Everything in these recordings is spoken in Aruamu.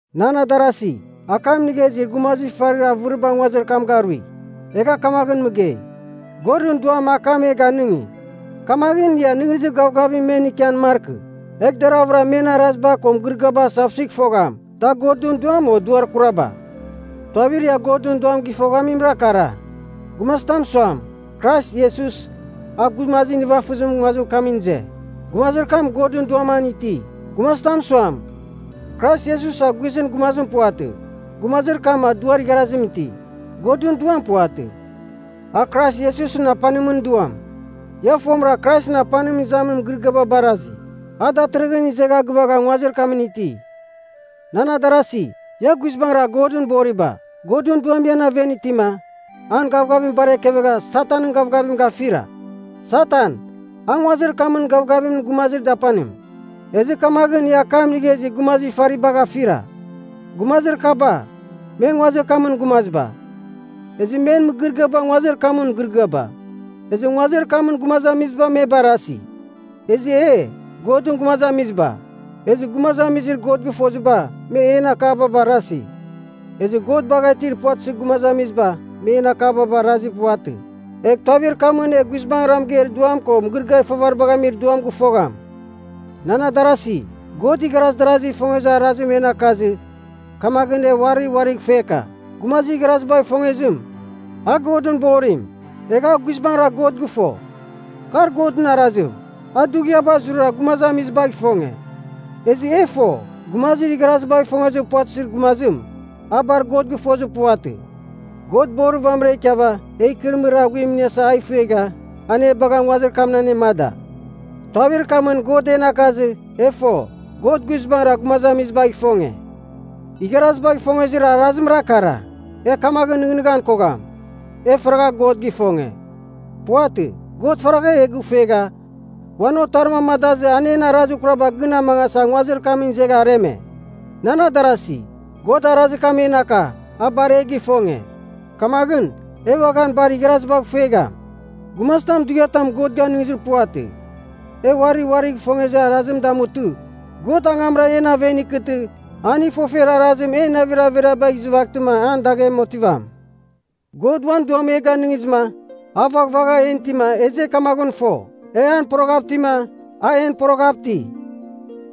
Nan adarasi, akam inigha izir gumazir ifarir avɨriba nguazir kam garui. Egha kamaghɨn mɨgei, Godɨn Duam akam e ganɨngi. Kamaghɨn ia nɨghnɨzir gavgavim men ikian markɨ. Egh deravɨra men araziba ko mɨgɨrɨgɨaba asavsuigh fogham, da Godɨn Duam o duar kuraba. Tuavir ia Godɨn Duam gɨfoghamimra kara: Gumazitam suam, Krais Iesus, a gumazir nivafɨzimɨn nguazir kamɨn ize, gumazir kam Godɨn Duam an iti. Gumazitam suam, Krais Iesus a guizɨn gumazim puvatɨ, gumazir kam a duar igharazim iti, Godɨn Duam puvatɨ. A Krais Iesusɨn apanimɨn duam. Ia fomɨra Kraisɨn apanim izamin mɨgɨrɨgɨam baraghizɨ, a datɨrɨghɨn izegha gɨvagha nguazir kamɨn iti. Nan adarasi, ia guizbangɨra Godɨn boriba. Godɨn Duam ian aven itima, an gavgavim bar ekevegha Satanɨn gavgavim gafira. Satan, a nguazir kamɨn gavgavimɨn gumazir dapanim. Ezɨ kamaghɨn ia akam inigha izir gumazir ifaribagh afira. Gumazir kaba, me nguazir kamɨn gumaziba. Ezɨ men mɨgɨrɨgɨaba nguazir kamɨn mɨgɨrɨgɨaba. Ezɨ nguazir kamɨn gumazamiziba me barasi. Ezɨ e, Godɨn gumazamiziba. Ezɨ gumazamizir God gɨfoziba, me en akaba barasi. Ezɨ God bagha itir puvatɨzir gumazamiziba me en akaba barazir puvatɨ. Egh tuavir kamɨn e guizbangɨra mɨgeir Duam ko mɨgɨrɨgɨar ifavaribagh amir duam gɨfogham. Nan adarasi, God igharaz darazigh ifongezir arazim en akazɨ. Kamaghɨn, e uari uarigh ifueka. Gumazir igharazibagh ifongezim, a Godɨn borim, egha a guizbangɨra God gɨfo. Kar Godɨn arazim, a dughiaba zurara gumazamizibagh ifonge. Ezɨ e fo, gumazir igharazibagh ifongezir puvatɨzir gumazim, a bar God gɨfozir puvatɨ. God borir vamɨra ikiava, e ikɨrɨmɨrir aghuim iniasa a ifuegha, an e bagha nguazir kamɨn anemada. Tuavir kamɨn God en akazɨ, e fo, God guizbangɨra gumazamizibagh ifonge. Igharazibagh ifongezir arazimra kara. E kamaghɨn nɨghnɨghan kogham, e faragha God gifonge. Puvatɨ. God faragha e gifuegha, uan Otarim amadazɨ an en arazir kuraba gɨn amangasa nguazir kamɨn izegha areme. Nan adarasi, God arazir kam en aka, a bar e gifonge. Kamaghɨn, e uaghan bar igharazibagh ifuegham. Gumazitam dughiatam Godɨn ganizir puvatɨ. E uari uarigh ifongezir arazim damutɨ, God angamra en aven ikɨtɨ, an ifofer arazim en navir averiabagh izɨvaghtɨma an daghem otivam. God uan Duam e ganɨngizɨma, a vaghvagha en itima, ezɨ e kamaghɨn fo, e an poroghav itima, a en poroghav iti.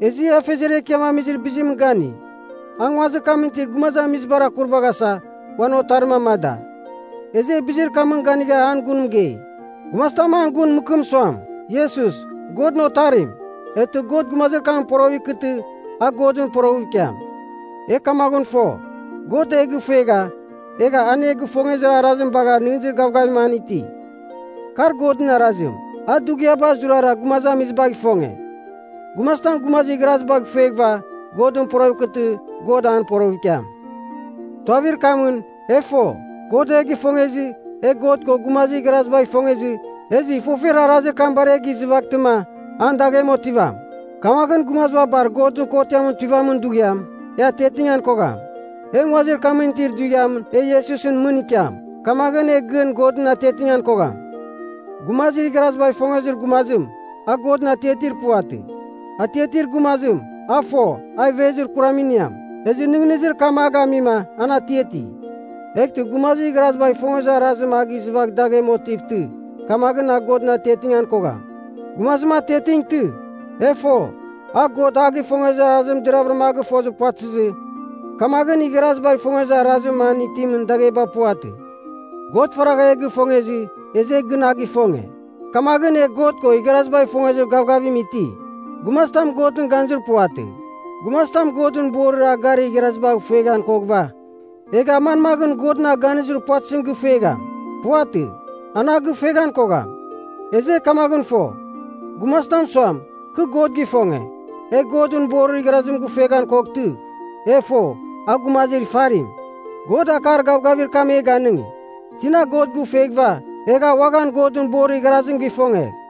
Ezɨ e Afeziar Ekiam amizir bizimɨn gani. A nguazimɨn itir gumazamizibar akurvaghasa, uan Otarim amada. Ezɨ e bizir kamɨn ganigha an gun mɨgei. Gumazitam an gun mɨkɨm suam, Iesus, Godɨn Otarim, eghtɨ God gumazir kamɨn poroghɨv ikɨtɨ, a Godɨn poroghɨv ikiam. E kamaghɨn fo, God e gifuegha, egha an e gifongezir arazim bagha nɨghnɨzir gavgavim an iti. Kar Godɨn arazim, a dughiaba zurara gumazamizibagh ifonge. Gumazitam gumazir igharazibagh ifueghɨva, Godɨn poroghɨv ikɨtɨ, God an poroghɨv ikiam. Tuavir kamɨn, e fo, God e gifongezɨ, e God ko gumazir igharazibagh ifongezɨ, ezɨ ifofer arazir kam bar e gizɨvaghtɨma, an daghem otivam. Kamaghɨn gumaziba bar Godɨn kotiamɨn tuivamin dughiam, e atiatingan kogham. E nguazir kamɨn itir dughiam e Iesusɨn mɨn ikiam, kamaghɨn e gɨn Godɨn atiatingan kogham. Gumazir igharazibagh ifongezir gumazim, a Godɨn atiatir puvatɨ. Atiatir gumazim, a fo, a ivezir kuram iniam, ezɨ nɨghnɨzir kam a gamima, an atiati. Eghtɨ gumazim igharazibagh ifongezir arazim a gɨzɨvagh daghem otivtɨ, kamaghɨn a Godɨn atiatingan kogham. Gumazim atiatingtɨ, e fo, a God a gifongezir arazim deravɨra a gɨfozir puvatɨzɨ, kamaghɨn igharazibagh ifongezir arazir an itimɨn dagheba puvatɨ. God faragha e gifongezɨ, ezɨ e gɨn a gifonge. Kamaghɨn e God ko igharazibagh ifongezir gavgavim iti. Gumazitam Godɨn ganizir puvatɨ. Gumazitam Godɨn borir a garir igharazibagh ifueghan koghɨva, egh a manmaghɨn Godɨn a ganizir puvatɨzim gifuegham? Puvatɨ. An a gifueghan kogham. Ezɨ e kamaghɨn fo, gumazitam suam, Kɨ God gifonge, egh Godɨn borir igharazim gɨfueghan koghtɨ, e fo, a gumazir ifarim. God akar gavgavir kam e ganɨngi. Tina God gifueghɨva, egh a uaghan Godɨn borir igharazim gifongegh.